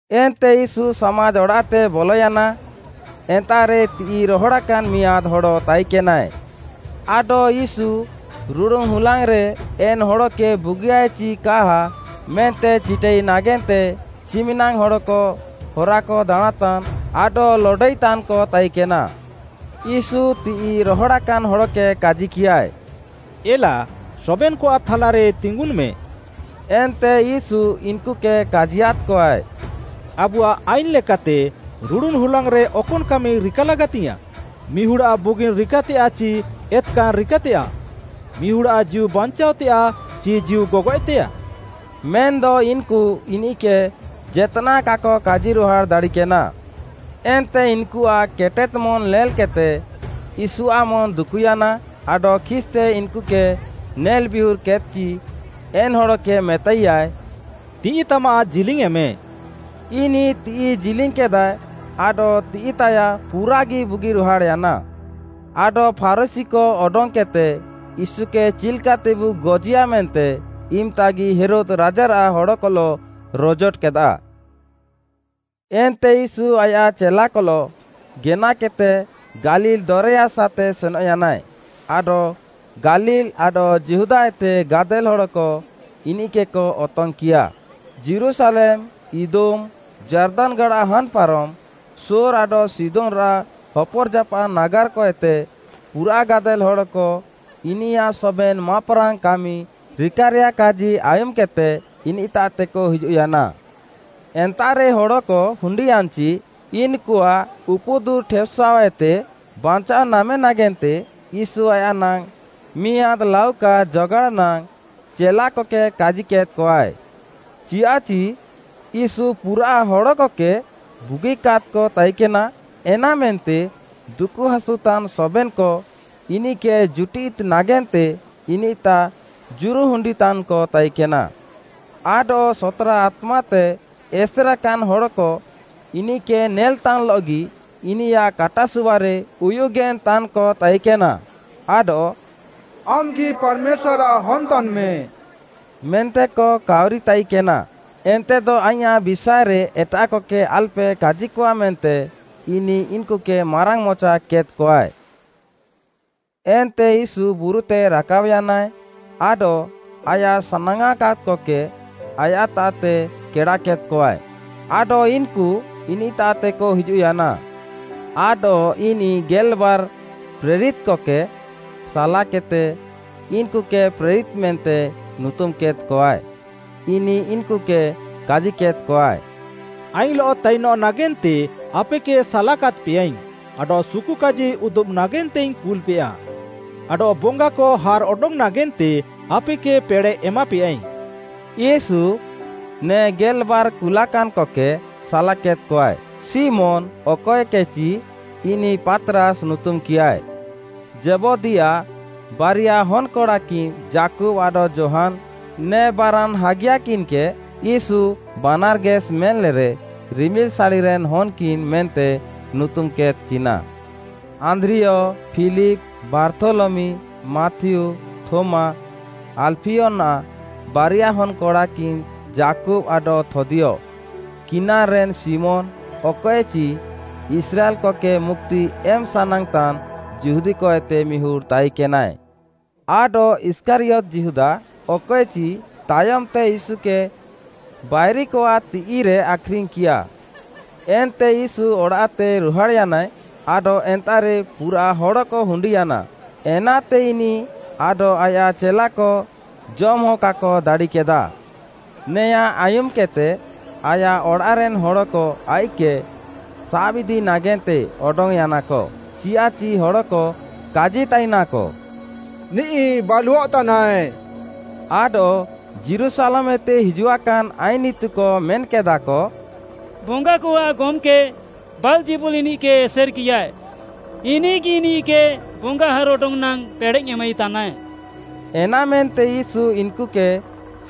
ଏନ୍ତେ ୟୀଶୁ ସାମାଜ୍‌ ଅଡ଼ାଃତେ ବଲୟାନା, ଏନ୍ତାଃରେ ତିଃଇ ରହଡ଼ାକାନ୍‌ ମିଆଁଦ୍‌ ହଡ଼ ତାଇକେନାଏ। ଆଡଃ ୟୀଶୁ ରୁଡ଼ୁନ୍‌ ହୁଲାଙ୍ଗ୍‌ରେ ଏନ୍‌ ହଡ଼କେ ବୁଗିୟାଏ ଚି କା ମେନ୍ତେ ଚିଟାଇ ନାଗେନ୍ତେ ଚିମିନାଙ୍ଗ୍‌ ହଡ଼କ ହରାକ ଦାଣାଁଁତାନ୍‌ ଆଡଃ ଲଡଇତାନ୍‌କ ତାଇକେନା। ୟୀଶୁ ତିଃଇ ରହଡ଼ାକାନ୍ ହଡ଼କେ କାଜିକିୟାଏ, “ଏଲା, ସବେନ୍‌କଆଃ ଥାଲାରେ ତିଙ୍ଗୁନ୍‌ମେ।” ଏନ୍ତେ ୟୀଶୁ ଇନ୍‌କୁକେ କାଜିୟାଦ୍‌କଆଏ, “ଆବୁଆଃ ଆଇନ୍‌ଲେକାତେ ରୁଡ଼ୁନ୍‌ ହୁଲାଙ୍ଗ୍‌ରେ ଅକନ୍‌ କାମି ରିକା ଲାଗାତିଙ୍ଗ୍‌ୟାଁଃ? ମିହୁଡ଼୍‌ଆଃ ବୁଗିନ୍‌ ରିକାତେୟାଃ ଚି ଏତ୍‌କାନ୍‌ ରିକାତେୟାଃ? ମିହୁଡ଼୍‌ଆଃ ଜୀଉ ବାଞ୍ଚାଅତେୟାଃ ଚି ଜୀଉ ଗଗଏଃତେୟାଃ?” ମେନ୍‌ଦ ଇନ୍‌କୁ ଇନିଃକେ ଜେତ୍‌ନାଃ କାକ କାଜିରୁହାଡ଼୍‌ ଦାଡ଼ିକେନା। ଏନ୍ତେ ଇନ୍‌କୁଆଃ କେଟେଦ୍‌ ମନ୍‌ ନେଲ୍‌କେଦ୍‌ତେ ୟୀଶୁଆଃ ମନ୍‌ ଦୁକୁୟାନା, ଆଡଃ ଖିସ୍‌ତେ ଇନ୍‌କୁକେ ନେଲ୍‌ବିୟୁର୍ କେଦ୍‌କଚି ଏନ୍‌ ହଡ଼କେ ମେତାଇୟାଏ, “ତିଃଇତାମାଃ ଜିଲିଙ୍ଗ୍‌ୟେଁମେ,” ଇନିଃ ତିଃଇ ଜିଲିଙ୍ଗ୍‌କେଦାଏ, ଆଡଃ ତିଃଇତାୟାଃ ପୁରାଗି ବୁଗିରୁହାଡ଼୍‌ୟାନା। ଆଡଃ ଫାରୁଶୀକ ଅଡଙ୍ଗ୍‌କେଦ୍‌ତେ ୟୀଶୁକେ ଚିଲ୍‌କାତେବୁ ଗଜିୟା ମେନ୍ତେ ଇମ୍‌ତାଗି ହେରୋଦ୍‌ ରାଜାରାଃ ହଡ଼କଲଃ ରଜୋଟ କେଦାଃ। ଏନ୍ତେ ୟୀଶୁ ଆୟାଃ ଚେଲାକଲଃ ଗେନାକେଦ୍‌ତେ ଗାଲିଲ୍‌ ଦରେୟାସାଃତେ ସେନଃୟାନାଏ, ଆଡଃ ଗାଲିଲ୍‌ ଆଡଃ ଯିହୁଦାଏତେ ଗାଦେଲ୍‌ ହଡ଼କ ଇନିଃକେକ ଅତଙ୍ଗ୍‌କିୟା, ଯୀରୁଶାଲେମ୍‌, ଇଦୁମ୍‌, ଯାର୍ଦାନ୍‌ ଗାଡ଼ା ହାନ୍‌ପାରମ୍‌, ସୋର୍‌ ଆଡଃ ସିଦୋନ୍‌ରାଃ ହପର୍‌ଜାପାଃ ନାଗାର୍‌କଏତେ ପୁରାଃ ଗାଦେଲ୍‌ ହଡ଼କ ଇନିୟାଃ ସବେନ୍‌ ମାପ୍‌ରାଙ୍ଗ୍‌ କାମି ରିକାରେୟାଃକାଜି ଆୟୁମ୍‌କେଦ୍‌ତେ ଇନିଃତାଃତେକ ହିଜୁଃୟାନା। ଏନ୍ତାଃରେ ହଡ଼କ ହୁଣ୍ଡିୟାନ୍‌ଚି ଇନ୍‌କୁଆଃ ଉପୁଦୁର୍‌ଠେପ୍‌ସାଅ ଏତେ ବାଞ୍ଚାଅ ନାମେ ନାଗେନ୍ତେ ୟୀଶୁ ଆୟାଃ ନାଙ୍ଗ୍‌ ମିଆଁଦ୍‌ ଲାଉକା ଜଗାଡ଼୍‌ନାଙ୍ଗ୍‌ ଚେଲାକକେ କାଜିକେଦ୍‌କଆଏ। ଚିୟାଃଚି, ୟୀଶୁ ପୁରାଃ ହଡ଼କକେ ବୁଗିକାଦ୍‌କ ତାଇକେନା, ଏନାମେନ୍ତେ ଦୁକୁହାସୁତାନ୍‌ ସବେନ୍‌କ, ଇନିଃକେ ଜୁଟିଦି ନାଗେନ୍ତେ ଇନିଃତାଃ ଜୁରୁହୁଣ୍ଡିନ୍‌ତାନ୍‌କ ତାଇକେନା। ଆଡଃ ସତ୍‌ରା ଆତ୍ମାତେ ଏସେରାକାନ୍‌ ହଡ଼କ ଇନିଃକେ ନେଲ୍‌ତାଇଲଃଗି ଇନିୟାଃ କାଟାସୁବାରେ ଉୟୁଗେନ୍‌ତାନ୍‌କ ତାଇକେନା, ଆଡଃ “ଆମ୍‌ଗି ପାର୍‌ମେଶ୍ୱାର୍‌ଆଃ ହନ୍‌ ତାନ୍‌ମେ” ମେନ୍ତେକ କାଉରିତାଇକେନା। ଏନ୍ତେଦ ଆଇଁୟାଃ ବିଷାଏରେ ଏଟାଃକକେ ଆଲ୍‌ପେ କାଜିକଆ ମେନ୍ତେ ଇନିଃ ଇନ୍‌କୁକେ ମାରାଙ୍ଗ୍‌ମଚା କେଦ୍‌କଆଏ। ଏନ୍ତେ ୟୀଶୁ ବୁରୁତେ ରାକାବ୍‌ୟାନାଏ, ଆଡଃ ଆୟାଃ ସାନାଙ୍ଗ୍‌ଆଁକାଦ୍‌କକେ ଆୟାଃତାଃତେ କେଡ଼ାକେଦ୍‌କଆଏ, ଆଡଃ ଇନ୍‌କୁ ଇନିଃତାଃତେକ ହିଜୁଃୟାନା। ଆଡଃ ଇନିଃ ଗେଲ୍‌ବାର୍‌ ପ୍ରେରିତ୍‌କକେ ସାଲାକେଦ୍‌ତେ, ଇନ୍‌କୁକେ ପ୍ରେରିତ୍‌ ମେନ୍ତେ ନୁତୁମ୍‌କେଦ୍‌କଆଏ। ଇନିଃ ଇନ୍‌କୁକେ କାଜିକେଦ୍‌କଆଏ, “ଆଇଙ୍ଗ୍‌ଲଃ ତାଇନଃ ନାଗେନ୍ତେ ଆପେକେ ସାଲାକାଦ୍‌ପେଆଇଙ୍ଗ୍‌, ଆଡଃ ସୁକୁକାଜି ଉଦୁବ୍‌ ନାଗେନ୍ତେଇଙ୍ଗ୍‌ କୁଲ୍‌ପେୟା। ଆଡଃ ବଙ୍ଗାକ ହାର୍‌ଅଡଙ୍ଗ୍‌ ନାଗେନ୍ତେ ଆପେକେ ପେଡ଼େଃ ଏମାପେୟାଇଙ୍ଗ୍‌।” ୟୀଶୁ ନେ ଗେଲ୍‌ବାର୍‌ କୁଲାକାନ୍‌କକେ ସାଲାକେଦ୍‌କଆଏ, ଶିମୋନ୍‌, ଅକଏକେଚି ଇନିଃ ପାତ୍‌ରାସ୍‌ ନୁତୁମ୍‌କିଆଏ। ଜେବଦୀଆଃ ବାରିୟା ହନ୍‌କଡ଼ାକିନ୍‌ ଯାକୁବ୍‌ ଆଡଃ ଯୋହାନ୍‌, ନେ ବାରାନ୍‌ ହାଗିୟାକିନ୍‌କେ ୟୀଶୁ, ବାନାର୍‌ଗେସ୍‌ ମେନ୍‌ଲେରେ “ରିମିଲ୍‌ସାଡ଼ିରେନ୍‌ ହନ୍‌କିନ୍‌” ମେନ୍ତେ ନୁତୁମ୍‌କେଦ୍‌କିନା; ଆନ୍ଦ୍ରିୟ, ଫିଲିପ୍‌, ବାର୍ଥୋଲମି, ମାଥିଉ, ଥୋମା, ଆଲ୍‌ଫିୟନାଃ ବାରିଆ ହନ୍‌କଡ଼ାକିନ୍‌ ଯାକୁବ୍‌ ଆଡଃ ଥଦ୍ଦିୟ, କିନାନ୍‌ରେନ୍‌ ଶିମୋନ୍‌, ଅକଏଚି ଇସ୍ରାଏଲ୍‌କକେ ମୁକ୍ତି ଏମ୍‌ ସାନାଙ୍ଗ୍‌ତାନ୍‌ ଯିହୁଦୀକ ଏତେ ମିହୁଡ଼୍‌ ତାଇକେନାଏ। ଆଡଃ ଇଷ୍କାରିୟତ୍‌ ଯିହୁଦା ଅକଏଚି, ତାୟମ୍‌ତେ ୟୀଶୁକେ ବାଇରିକଆଃ ତିଃଇରେ ଆଖ୍‌ରିଙ୍ଗ୍‌କିୟା। ଏନ୍ତେ ୟୀଶୁ ଅଡ଼ାଃତେ ରୁହାଡ଼୍‌ୟାନାଏ, ଆଡଃ ଏନ୍ତାଃରେ ପୁରାଃ ହଡ଼କ ହୁଣ୍ଡିୟାନା, ଏନାତେ ଇନିଃ ଆଡଃ ଆୟାଃ ଚେଲାକ ଜମ୍‌ହ କାକ ଦାଡ଼ିକେଦାଃ। ନେୟାଁ ଆୟୁମ୍‌କେଦ୍‌ତେ ଆୟାଃ ଅଡ଼ାଃରେନ୍‌ ହଡ଼କ ଆଇଃକ୍‌କେ ସାବ୍‌ଇଦି ନାଗେନ୍ତେ ଅଡଙ୍ଗ୍‌ୟାନାକ, ଚିୟାଃଚି ହଡ଼କ କାଜିତାଇନାକ, “ନିଃ ବାଲୁଅଃତାନାଏ।” ଆଡଃ, ଯୀରୁଶାଲେମ୍‌ଏତେ ହିଜୁଆକାନ୍‌ ଆଇନ୍‌ ଇତୁକ ମେନ୍‌କେଦାଃକ “ବଙ୍ଗାକଆଃ ଗମ୍‌କେ ବାଲ୍‌ଜେବୁଲ୍‌ ଇନିଃକେ ଏସେର୍‌କିୟାଏ। ଇନିଃଗି ଇନିଃକେ ବଙ୍ଗା ହାର୍‌ଅଡଙ୍ଗ୍‌ ନାଙ୍ଗ୍‌ ପେଡ଼େଃ ଏମାଇତାନାଏ।” ଏନାମେନ୍ତେ ୟୀଶୁ ଇନ୍‌କୁକେ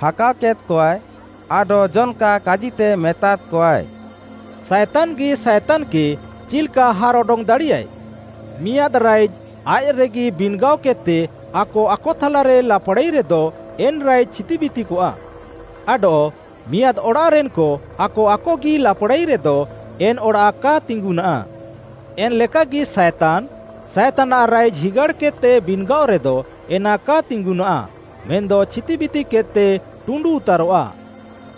ହାକାଅକେଦ୍‌କଆଏ, ଆଡଃ ଜନ୍‌କା କାଜିତେ ମେତାଦ୍‌କଆଏ, “ସାଏତାନ୍‌ଗିଃ ସାଏତାନ୍‌କେ ଚିଲ୍‌କା ହାର୍‌ଅଡଙ୍ଗ୍‌ ଦାଡ଼ିୟାଏ? ମିଆଁଦ୍‌ ରାଇଜ୍‌ ଆୟାଃରେଗି ବିନ୍‌ଗାଅକେଦ୍‌ତେ ଆକ ଆକଥାଲାରେ ଲାପ୍‌ଡ଼ାଇରେଦ ଏନ୍‌ ରାଇଜ୍‌ ଛିତିବିତିକଆଃ। ଆଡଃ, ମିଆଁଦ୍‌ ଅଡ଼ାଃରେନ୍‌କ ଆକ ଆକଗି ଲାପ୍‌ଡ଼ାଇରେଦ ଏନ୍‌ ଅଡ଼ାଃ କା ତିଙ୍ଗୁନାଃ। ଏନ୍‌ଲେକାଗି ସାଏତାନ୍‌, ସାଏତାନ୍‌ଆଃ ରାଇଜ୍‌ ହିଗାଡ଼୍‌କେଦ୍‌ତେ ବିନ୍‌ଗାଅରେଦ ଏନା କା ତିଙ୍ଗୁନାଃ, ମେନ୍‌ଦ ଛିତିବିତିକେଦ୍‌ତେ ଟୁଣ୍ଡୁଉତାରଃଆ।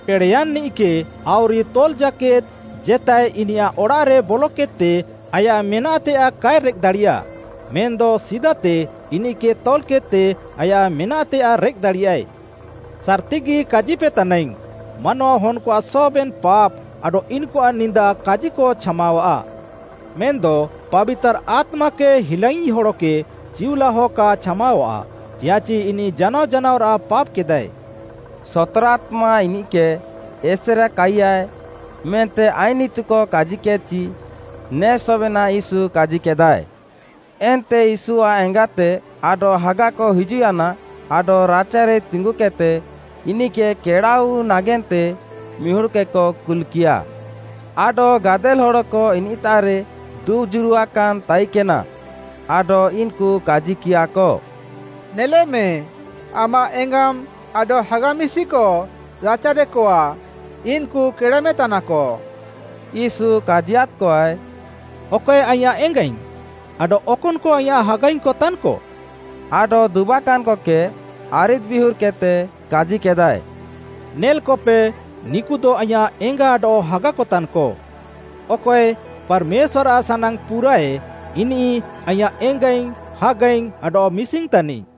“ପେଡ଼େୟାନ୍‌ନିଃକେ ଆଉରି ତଲ୍‌ ଜାକେଦ୍‌ ଜେତାଏ ଇନିୟାଃ ଅଡ଼ାଃରେ ବଲକେଦ୍‌ତେ ଆୟାଃ ମେନାଃତେୟାଃ କାଏ ରେଃକ୍‌ଦାଡ଼ିୟା, ମେନ୍‌ଦ ସିଦାତେ ଇନିଃକେ ତଲ୍‌କେଦ୍‌ତେ ଆୟାଃ ମେନାଃତେୟାଃ ରେଃକ୍‌ଦାଡ଼ିୟାଏ। “ସାର୍‌ତିଗି କାଜିପେତାନାଇଙ୍ଗ୍‌, ମାନୱାହନ୍‌କଆଃ ସବେନ୍‌ ପାପ୍‌ ଆଡଃ ଇନ୍‌କୁଆଃ ନିନ୍ଦା କାଜିକ ଛାମାୱାଃ; ମେନ୍‌ଦ ପାବିତାର୍‌ ଆତ୍ମାକେ ହିଲାଙ୍ଗ୍‌ଇ ହଡ଼କେ ଚିଉଲାହ କା ଛାମାୱାଃ, ଚିୟାଃଚି ଇନିଃ ଜାନାଅ ଜାନାଅରାଃ ପାପ୍‌ କେଦାଏ।” “ସତ୍‌ରା ଆତ୍ମା ଇନିଃକେ ଏସେରାକାଇୟାଏ” ମେନ୍ତେ ଆଇନ୍‌ ଇତୁକ କାଜିକେଦ୍‌ଚି ନେ ସବେନାଃ ୟୀଶୁ କାଜିକେଦାଏ। ଏନ୍ତେ ୟୀଶୁଆଃ ଏଙ୍ଗାତେ ଆଡଃ ହାଗାକ ହିଜୁଃୟାନା ଆଡଃ ରାଚାରେ ତିଙ୍ଗୁକେଦ୍‌ତେ, ଇନିଃକେ କେଡ଼ାଆଉୱି ନାଗେନ୍ତେ ମିହୁଡ଼୍‌କେକ କୁଲ୍‌କିୟାଃ। ଆଡଃ ଗାଦେଲ୍‌ ହଡ଼କ ଇନିଃତାଃରେ ଦୁବ୍‌ ଜୁରୁଆକାନ୍‌କ ତାଇକେନା, ଆଡଃ ଇନ୍‌କୁ କାଜିକିୟାଃକ, “ନେଲେମେ, ଆମାଃ ଏଙ୍ଗାମ୍‌ ଆଡଃ ହାଗା ମିଶିକ ରାଚାରେକଆ, ଇନ୍‌କୁ କେଡ଼ାମେତାନାକ।” ୟୀଶୁ କାଜିୟାଦ୍‌କଆଏ, “ଅକଏ ଆଇଁୟାଃ ଏଙ୍ଗାଇଙ୍ଗ୍‌? ଆଡଃ ଅକନ୍‌କ ଆଇଁୟାଃ ହାଗାଇଙ୍ଗ୍‌କ ତାନ୍‌କ?” ଆଡଃ ଦୁବାକାନ୍‌କକେ, ଆରିଦ୍‌ବିୟୁର୍‌କେଦ୍‌ତେ କାଜିକେଦାଏ, “ନେଲ୍‌କପେ ନିକୁଦ ଆଇଁୟାଃ ଏଙ୍ଗା ଆଡଃ ହାଗାକତାନ୍‌କ। ଅକଏ, ପାର୍‌ମେଶ୍ୱାର୍‌ଆଃ ସାନାଙ୍ଗ୍‌ ପୁରାଃଏ, ଇନିଃ ଆଇଁୟାଃ ଏଙ୍ଗାଇଙ୍ଗ୍‌, ହାଗାଇଙ୍ଗ୍‌ ଆଡଃ ମିଶିଙ୍ଗ୍‌ ତାନିଃ।”